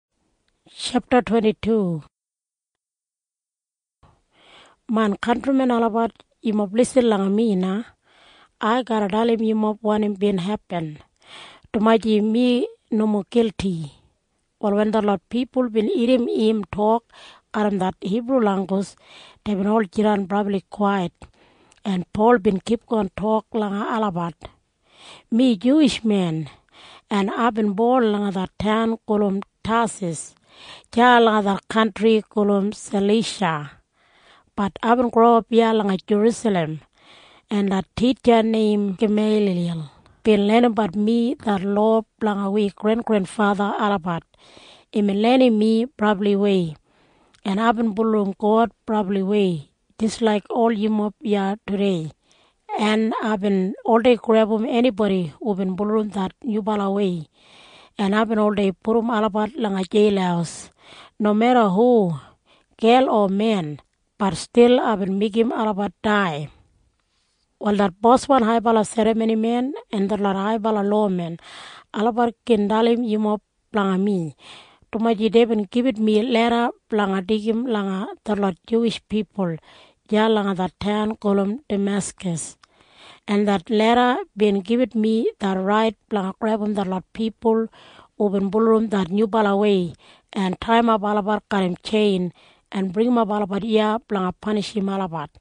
Pol bin tok, “Main kantrimen olabat, yumob lisin langa mi na. Ai garra dalim yumob wanim bin hepin, dumaji mi nomo gilti.” Wal wen detlot pipul bin irrim im tok garram det Hibru langgus, deibin ol jidan brabli kwait, en Pol bin kipgon tok langa olabat. “Mi Juwish men, en aibin bon langa det taun gulum Tasas deya langa det kantri gulum Salisha. Bat aibin growap iya langa Jerusalem, en det titja neim Gameiliyal bin lenimbat mi det lowa blanga wi grengrenfatha olabat. Imbin lenim mi brabliwei, en aibin bulurrum God brabliwei jis laik ol yumob iya tudei, en aibin oldei grebum enibodi hubin bulurrum det nyubalawei, en aibin oldei pudum olabat langa jeil. Nomeda hu, gel o men, bat stil aibin meigim olabat dai. “Wal det boswan haibala serramonimen en detlot haibala lowamen olabat gin dalim yumob blanga mi, dumaji deibin gibit mi leda blanga deigim langa detlot Juwish pipul deya langa det taun gulum Dameskas, en det leda bin gibit mi det rait blanga grebum detlot pipul hubin bulurrum det nyubalawei en taiyimap olabat garram tjein en bringimap olabat iya blanga panishim olabat.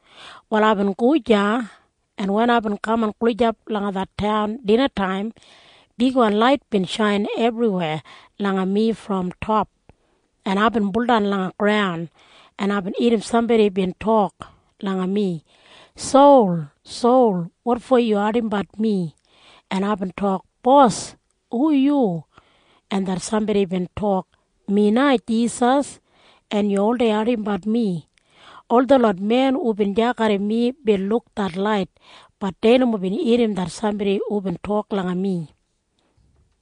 “Wal aibin go deya, en wen aibin kaman gulijap langa det taun dinataim, bigwan lait bin shain ebriwei langa mi brom top, en aibin buldan langa graun, en aibin irrim sambodi bin tok langa mi, ‘Sol, Sol, wotfo yu ardimbat mi?’ En aibin tok, ‘Bos, hu yu?’ En det sambodi bin tok, ‘Mi na Jisas, en yu na bin oldei ardimbat mi.’ Ol detlot men hubin deya garram mi bin luk det lait. Bat dei nomo bin irrim det sambodi hubin tok langa mi.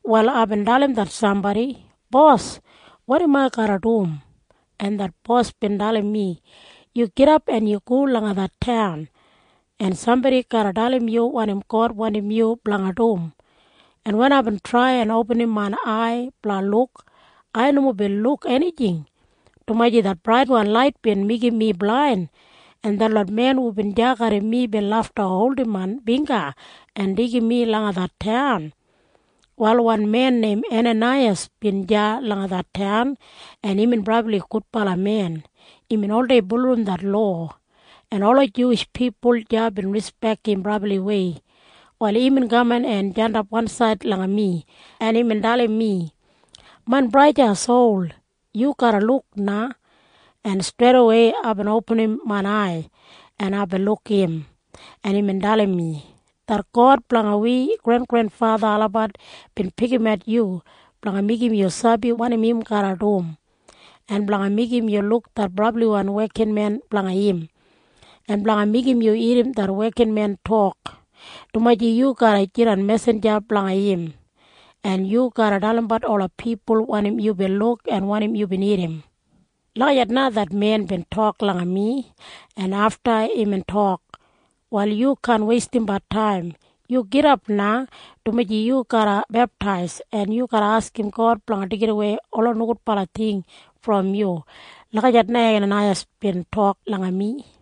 “Wal aibin dalim det sambodi, ‘Bos, wanim ai garra dum?’ En det Bos bin dalim mi, ‘Yu gidap en go langa det taun, en sambodi deya garra dalim yu wanim God wandim yu blanga dum.’ En wen aibin trai en opinim main ai blanga luk, ai nomo bin luk enijing, dumaji det braitwan lait bin meigim mi blain, en detlot men hubin deya garram mi bin lafta holdim main bingga en deigim mi langa det taun. “Wal wan men neim Enanaiyas bin deya langa det taun, en imbin brabli gudbala men. Imbin oldei bulurrum det lowa, en ola Juwish pipul deya bin rispek im brabliwei. Wal imbin kaman en jandap wansaid langa mi, en imbin dalim mi, ‘Main braja Sol, yu garra luk na.’ En streidawei aibin opinim main ai, en aibin luk im, en imbin dalim mi, ‘Det God blanga wi grengrenfatha olabat bin pikimat yu blanga meigim yu sabi wanim im garra dum, en blanga meigim yu luk det brabliwan wekinmen blanga im, en blanga meigim yu irrim det wekinmen tok, dumaji yu garra jidan mesinja blanga im, en yu garra dalimbat ola pipul wanim yubin luk en wanim yubin irrim.’ Lagijat na det men bin tok langa mi, en afta imbin tok, ‘Wal yu kaan weistimbat taim. Yu gidap na, dumaji yu garra beptais, en yu garra askim God blanga deigidawei ola nogudbala ting brom yu.’ Lagijat na Enanaiyas bin tok langa mi.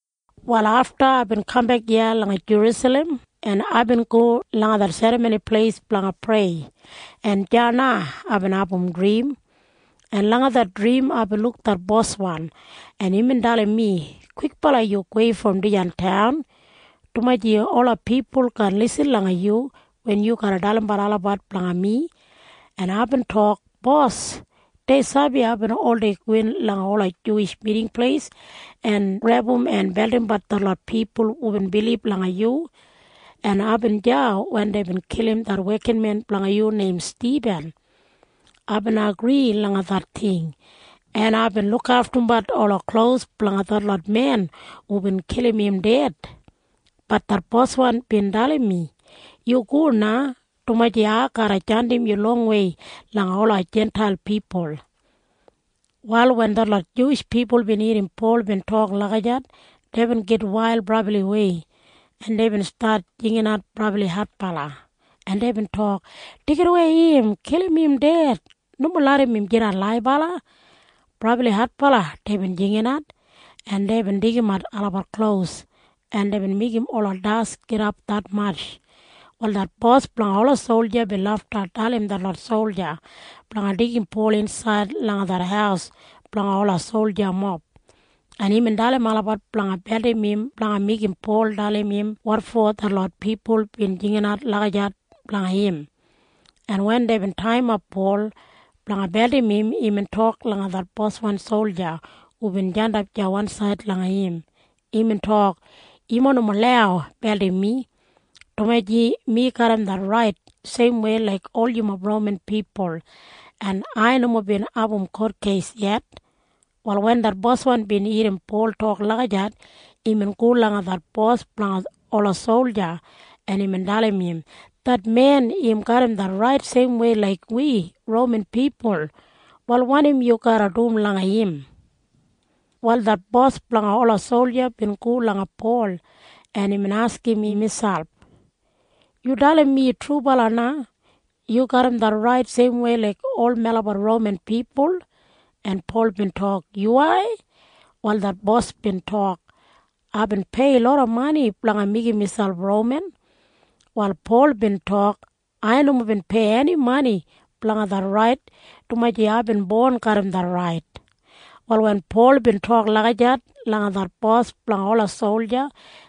“Wal afta aibin kambek iya langa Jerusalem, en aibin go langa det Serramoni Pleis blanga prei, en deya na aibin abum drim, en langa det drim aibin luk det Boswan, en imbin dalim mi. ‘Kwikbala yu gowei brom dijan taun, dumaji ola pipul kaan lisin langa yu wen yu garra dalimbat olabat blanga mi.’ En aibin tok, ‘Bos, dei sabi aibin oldei gowin langa ola Juwish Miting Pleis en grebum en beldimbat detlot pipul hubin bilib langa yu, en aibin deya wen deibin kilim det wekinmen blanga yu neim Stibin. Aibin agri langa det ting, en aibin lukaftumbat ola klos blanga detlot men hubin kilim im ded.’ Bat det Boswan bin dalim mi. ‘Yu go na, dumaji ai garra jandim yu longwei langa ola Jintail pipul.’” Wal wen detlot Juwish pipul bin irrim Pol tok lagijat, deibin gitwail brabliwei, en deibin stat jinginat brabli adbala, en deibin tok, “Deigidawei im! Kilim im ded! Nomo larram im jidan laibala!” Brabli adbala deibin jinginat, en deibin deigimat olabat klos, en deibin meigim ola das gidap detmatj. Wal det bos blanga ola solja bin lafta dalim detlot solja blanga deigim Pol insaid langa det haus blanga ola soljamob, en imbin dalim olabat blanga beldim im blanga meigim Pol dalim im wotfo detlot pipul bin jinginat lagijat blanga im, en wen deibin taiyimap Pol blanga beldim im, imbin tok langa det boswan solja hubin jandap deya wansaid langa im. Imbin tok, “Yumob nomo lau beldim mi, dumaji mi garram det rait seimwei laik ol yumob Roman pipul, en ai nomo bin abum kotkeis yet.” Wal wen det boswan bin irrim Pol tok lagijat, imbin go langa det bos blanga ola solja, en imbin dalim im, “Det men im garram det rait seimwei laik wi Roman pipul. Wal wanim yu garra dum langa im?” Wal det bos blanga ola solja bin go langa Pol, en imbin askim im miselp, “Yu dalim mi trubala na. Yu garram det rait seimwei laik ol melabat Roman pipul?” En Pol bin tok, “Yuwai.” Wal det bos bin tok, “Aibin pei loda mani blanga meigim miselp Roman.” Wal Pol bin tok, “Ai nomo bin pei eni mani blanga det rait, dumaji aibin bon garram det rait.” Wal wen Pol bin tok lagijat langa det bos blanga ola solja,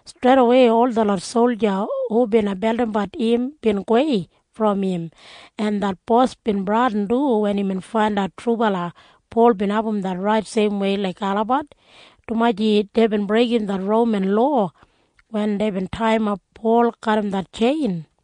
streidawei ol detlot solja hu bina beldimbat im bin gowei brom im, en det bos bin bradin du wen imbin faindat trubala Pol bin abum det rait seimwei laik olabat, dumaji deibin breigim det Roman lowa wen deibin taiyimap Pol garram det tjein.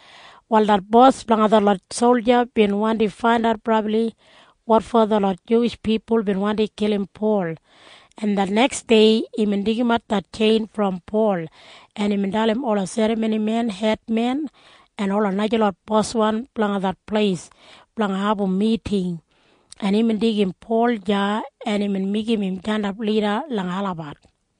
Wal det bos blanga detlot solja bin wandi faindat brabli wotfo detlot Juwish pipul bin wandi kilim Pol, en det neksdei imbin deigimat det tjein brom Pol, en imbin dalim ola serramonimen hedmen en ola najalot boswan blanga det pleis blanga abum miting, en imbin deigim Pol deya, en imbin meigim im jandap lida langa olabat.